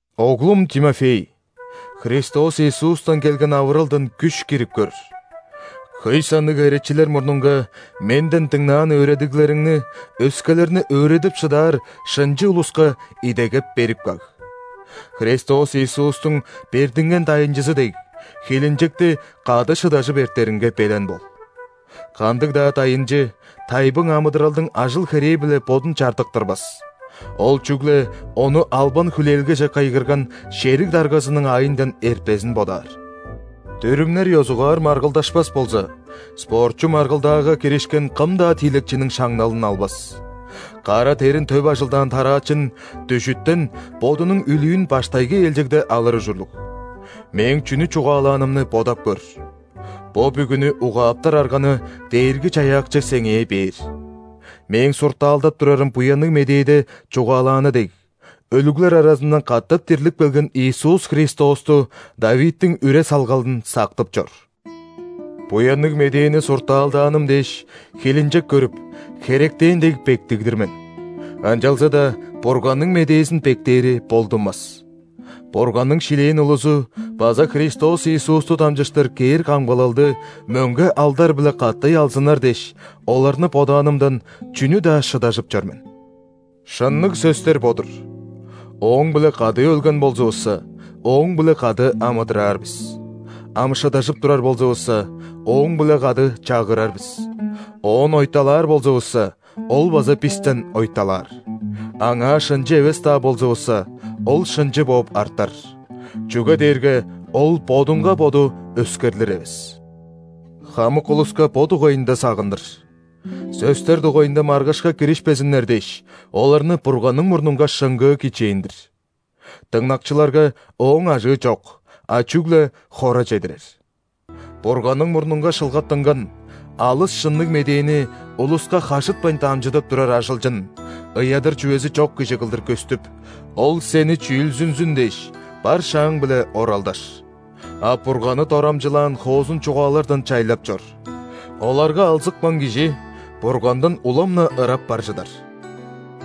Оглум Тимофей, Христос Иисустан келген авыралдан күш кирип көр. Хөй санныг херечилер мурнунга менден дыңнаан өөредиглериңни өскелерни өөредип шыдаар шынчы улуска идегеп берип каг. Христос Иисустуң бердинген дайынчызы дег, хилинчекти кады шыдажып эртеринге белен бол. Кандыг-даа дайынчы тайбың амыдыралдың ажыл-херээ-биле бодун чардыктырбас, ол чүгле ону албан-хүлээлгеже кыйгырган шериг даргазының аайындан эртпезин бодаар. Дүрүмнер ёзугаар маргылдашпас болза, спортчу маргылдаага киришкен кым-даа тиилекчиниң шаңналын албас. Кара дерин төп ажылдаан тараачын дүжүттен бодунуң үлүүн баштайгы ээлчегде алыр ужурлуг. Мээң чүнү чугаалаанымны бодап көр. Бо бүгүнү угааптар арганы Дээрги-Чаяакчы сеңээ бээр. Мээң суртаалдап турарым Буянныг Медээде чугаалааны дег, өлүглер аразындан катап дирлип келген Иисус Христосту – ·Давидтиң үре-салгалын сактып чор. Буянныг Медээни суртаалдааным дээш, хилинчек көрүп, херектен дег бектиг-дир мен. Ынчалза-даа Бурганның медээзин бектээри болдунмас! Бурганның шилээн улузу база Христос Иисусту дамчыштыр кээр камгалалды мөңге алдар-биле катай алзыннар дээш, оларны бодаанымдан, чүнү-даа шыдажып чор мен. Шынныг сөстер бо-дур:«Ооң-биле кады өлген болзувусса,Ооң-биле кады амыдыраар бис. Ам шыдажып турар болзувусса,Ооң-биле кады чагырар бис.Оон ойталаар болзувусса,Ол база бистен ойталаар. Аңаа шынчы эвес-даа болзувусса,Ол шынчы бооп артар,чүге дээрге Ол Бодунга Боду өскерлир эвес». Хамык улуска бо дугайында сагындыр. Сөстер дугайында маргышка киришпезиннер дээш, оларны Бурганның мурнунга шыңгыы кичээндир. Дыңнакчыларга ооң ажыы чок, а чүгле хора чедирер. Бурганның мурнунга шылгаттынган, алыс шынныг медээни улуска хажытпайн дамчыдып турар ажылчын, ыядыр чүвези чок кижи кылдыр көстүп, Ол сени чүүлзүнзүн дээш, бар шааң-биле оралдаш. А Бурганны дорамчылаан хоозун чугаалардан чайлап чор. Оларга алзыпкан кижи Бургандан улам-на ырап бар чыдар.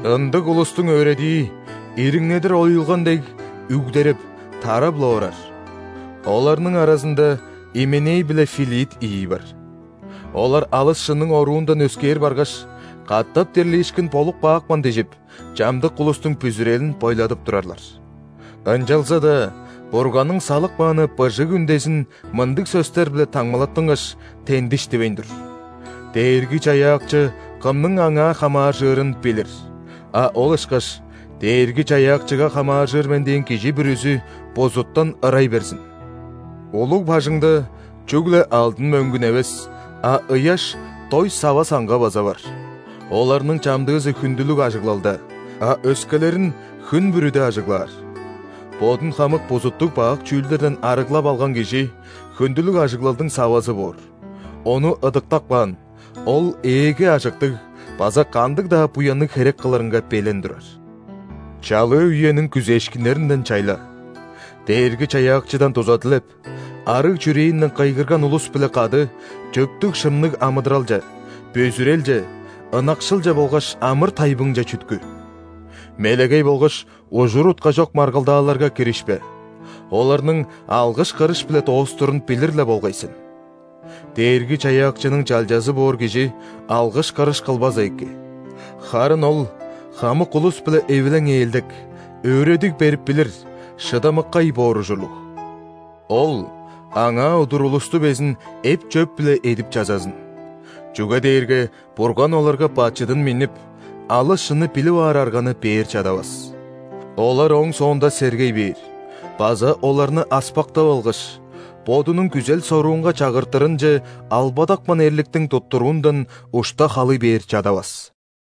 Ындыг улустуң өөредии, ириңнедир оюлган дег, үгдереп, тарап-ла орар. Оларның аразында Именей биле Филит ийи бар. Олар алыс шынның оруундан өскээр баргаш: «Катап дирлиишкин болуп каапкан» – дижип, чамдык улустуң бүзүрелин бойладып турарлар. Ынчалза-даа Бурганның салып кааны быжыг үндезин мындыг сөстер-биле таңмалаттынгаш, тендиш дивейн тур: «Дээрги-Чаяакчы кымның Аңаа хамааржырын билир», а ол ышкаш: «Дээрги-Чаяакчыга хамааржыр мен дээн кижи бүрүзү бузуттан ырай берзин». Улуг бажыңда чүгле алдын, мөңгүн эвес, а ыяш, дой сава-саңга база бар: оларның чамдыызы хүндүлүг ажыглалда, а өскелерин хүн бүрүде ажыглаар. Бодун хамык бузуттуг-бак чүүлдерден арыглап алган кижи хүндүлүг ажыглалдың савазы боор: ону ыдыктап каан, ол Ээге ажыктыг база кандыг-даа буянныг херек кылырынга белен турар. Чалыы үениң күзээшкиннеринден чайла, Дээрги-Чаяакчыдан дуза дилеп, арыг чүрээнден кыйгырган улус-биле кады чөптүг-шынныг амыдыралче, бүзүрелче, ынакшылче болгаш амыр-тайбыңче чүткү. Мелегей болгаш ужур-утка чок маргылдааларга киришпе, оларның алгыш-кырыш-биле доостурун билир-ле болгай сен. Дээрги-Чаяакчының чалчазы боор кижи алгыш-кырыш кылбаза эки. Харын ол хамык улус-биле эвилең-ээлдек, өөредиг берип билир, шыдамыккай боор ужурлуг. Ол аңаа удур улусту безин эп-чөп-биле эдип-чазазын. Чүге дээрге Бурган оларга бачыдын миннип, алыс шынны билип аар арганы бээр чадавас. Олар ооң соонда сергей бээр база оларны аспактап алгаш, бодунуң күзел-соруунга чагыртырынче албадапкан эрликтиң туттуруундан ушта халый бээр чадавас.